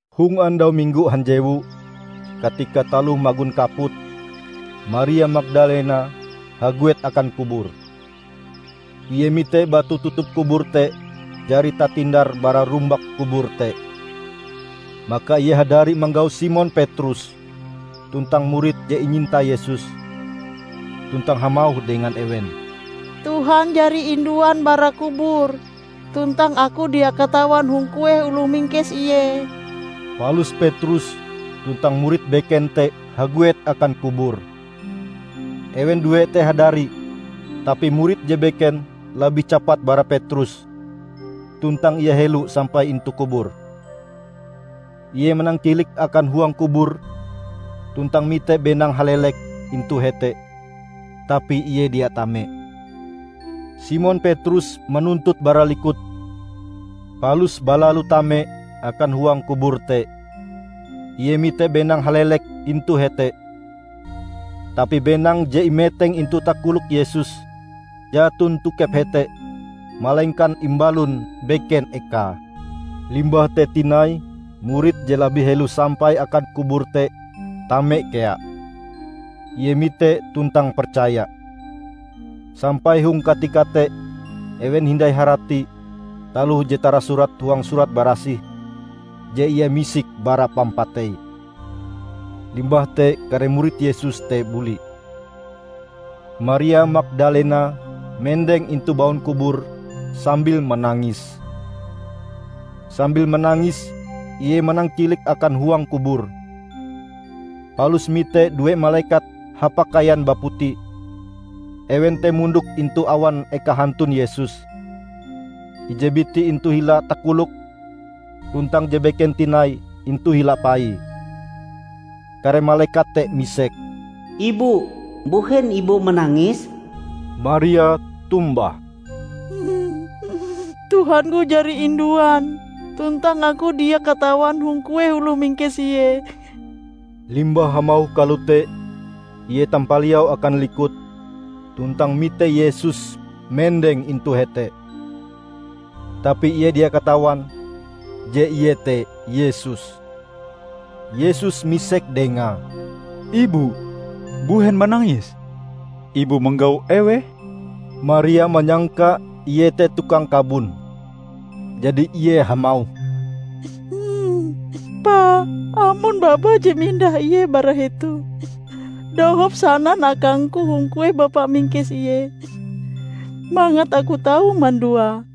Hong andau Minggo hanjewu, katika taloh magon kaput, Maria Magdalena haguet akan kubur. Ie mite batu tutup kubur te jari tatindar bara rumbak kubur te. Maka ie hadari manggau Simon Petrus tuntang murid je inyinta Yesus, tuntang hamauh dengan ewen, "Tuhan jari induan bara kubur, tuntang aku dia katawan hong kueh oloh mingkes Ie." Palus Petrus tuntang murid beken te haguet akan kubur. Ewen due te hadari, tapi murid je beken labih capat bara Petrus, tuntang ie helo sampai intu kubur. Ie manangkilik akan huang kubur tuntang mite benang halelek intu hete, tapi ie dia tame. Simon Petrus manuntut bara likut, palus balalu tame akan huang kubur te. Ie mite benang halelek intu hete, tapi benang je imeteng intu takolok Yesus jaton tokep hete malengkan imbalon beken ekae. Limbah te tinai murid je labih helo sampai akan kubur te, tame kea. Ie mitee tuntang percaya. ( Sampai hong katika te ewen hindai harati taloh je tarasurat huang Surat Barasih je Ie misik bara pampatei.) Limbah te kare murid Yesus te buli. Maria Magdalena mendeng intu baun kubur sambil manangis. Sambil manangis ie manangkilik akan huang kubur. Palus mite due malekat hapakaian baputi. Ewen te mondok intu awan eka hantun Yesus, ije biti intu hila takoloke, tuntang je beken tinai intu hila paie. Kare malekat te misek, "Ibu, mbuhen ibu manangis?" Maria tombah, "Tuhangku jari induan, tuntang aku dia katawan hong kueh oloh mingkes Ie." Limbah hamauh kalote, ie tampaliau akan likut tuntang mite Yesus mendeng intu hete. Tapi ie dia katawan je Ie te Yesus. Yesus misek dengae, "Ibu mbuhen manangis, ibu manggau eweh?" Maria manyangka ie te tukang kabon, jadi ie hamauh, "Pa, amon bapa je mindah Ie bara hetoh, dohop sanan akangku hong kueh bapa mingkes Ie, mangat aku tau manduae."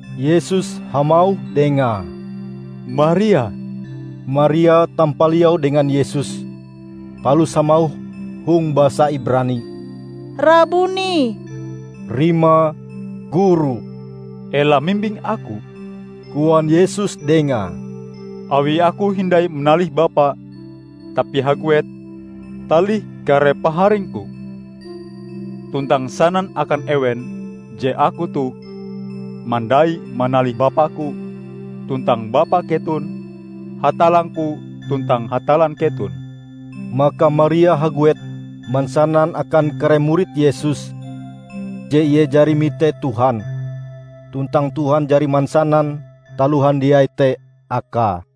Yesus hamauh dengae, "Maria!" Maria tampaliau dengan Yesus palus hamauh hong basa Ibrani, "Rabuni!" (Rimae "Guru".) "Ela mimbing Aku," koan Yesus dengae, "awi Aku hindai manalih Bapa. Tapi haguet, talih kare paharing-Ku, tuntang sanan akan ewen je Aku toh mandai manalih Bapa-Ku tuntang Bapa keton, Hatallang-Ku tuntang Hatallan keton." Maka Maria haguet mansanan akan kare murid Yesus je ie jari mite Tuhan tuntang Tuhan jari mansanan taloh handiai te akae.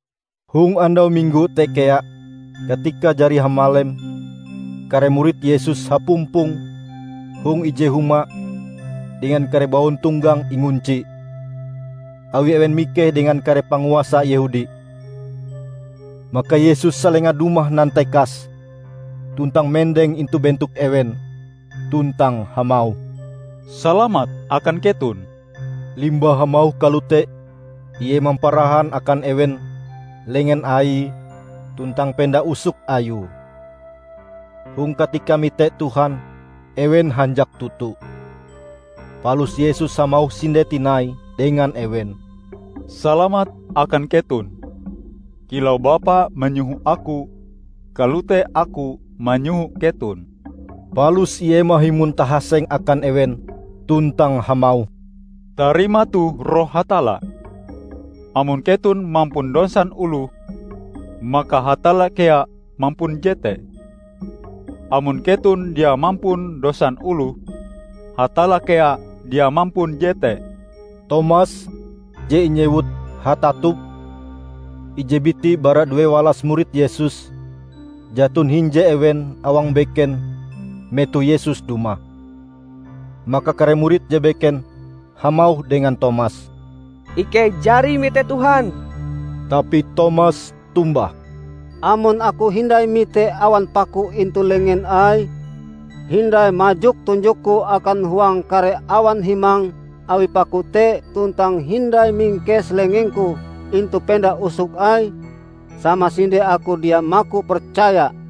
Hong andau Minggo te kea, katika jari hamalem, kare murid Yesus hapumpong hong ije huma dengan kare bauntonggang ingunci, awi ewen mikeh dengan kare panguasa Yehudi. Maka Yesus salenga dumah nantekas tuntang mendeng intu bentok ewen tuntang hamauh, "Salamat akan keton." Limbah hamauh kalote, Ie mamparahan akan ewen lengen Aie tuntang penda usok Ayue. Hong katika mite Tuhan, ewen hanjak toto. Palus Yesus hamauh sinde tinai dengan ewen, "Salamat akan keton. Kilau Bapa manyoho Aku, kalote Aku manyoho keton." Palus Ie mahimon tahasenge akan ewen tuntang hamauh, "Tarima toh Roh Hatalla. Amon keton mampun dosan oloh, maka Hatalla kea mampun jete. Amon keton dia mampun dosan oloh, Hatalla kea dia mampun jete." Tomas (Je inyewut "Hatatup"), ije biti bara duewalas murid Yesus, jaton hinje ewen awang beken metoh Yesus dumah. Maka kare murid je beken hamauh dengan Tomas, "Ikei jari mite Tuhan!" Tapi Tomas tombah, "Amon Aku hindai mite awan paku intu lengen Aie, hindai majok tunjokku akan huang kare awan himang awi paku te tuntang hindai mingkes lengengku intu penda usok Aie, samasinde aku dia maku percaya."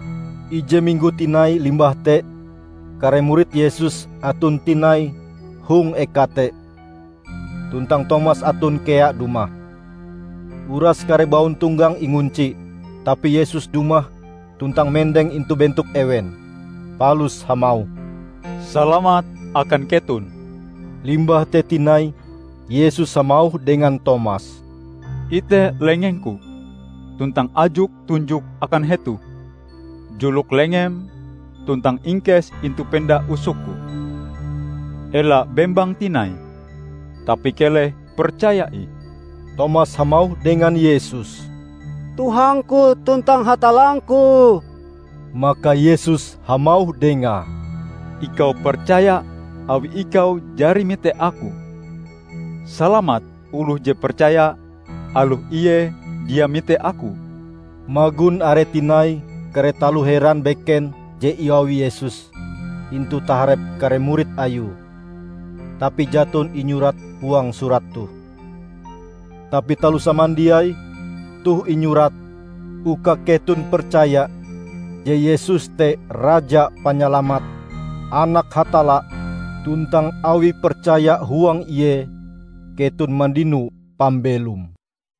Ije minggo tinai limbah te kare murid Yesus aton tinai hong eka te, tuntang Tomas aton kea dumah. Uras kare bauntonggang ingunci. Tapi Yesus dumah tuntang mendeng intu bentok ewen, palus hamauh, "Salamat akan keton." Limbah te tinai Yesus hamauh dengan Tomas, "Ite lengeng-Ku, tuntang ajok tunjokm akan hetoh. Julok lengem tuntang ingkes intu penda usok-Ku. Ela bembang tinai, tapi keleh percaya ih!" Tomas hamauh dengan Yesus, "Tuhangku tuntang Hatallangku!" Maka Yesus hamauh dengae, "Ikau percaya awi ikau jari mite Aku. Salamat oloh je percaya aloh ie dia mite Aku!" Magon are tinai kare taloh heran beken je iawi Yesus intu taharep kare murid Ayue, tapi jaton inyurat huang surat toh. Tapi taloh samandiai toh inyurat, uka keton percaya je Yesus te Raja Panyalamat, anak Hatalla, tuntang awi percaya huang Ie keton mandino pambelom.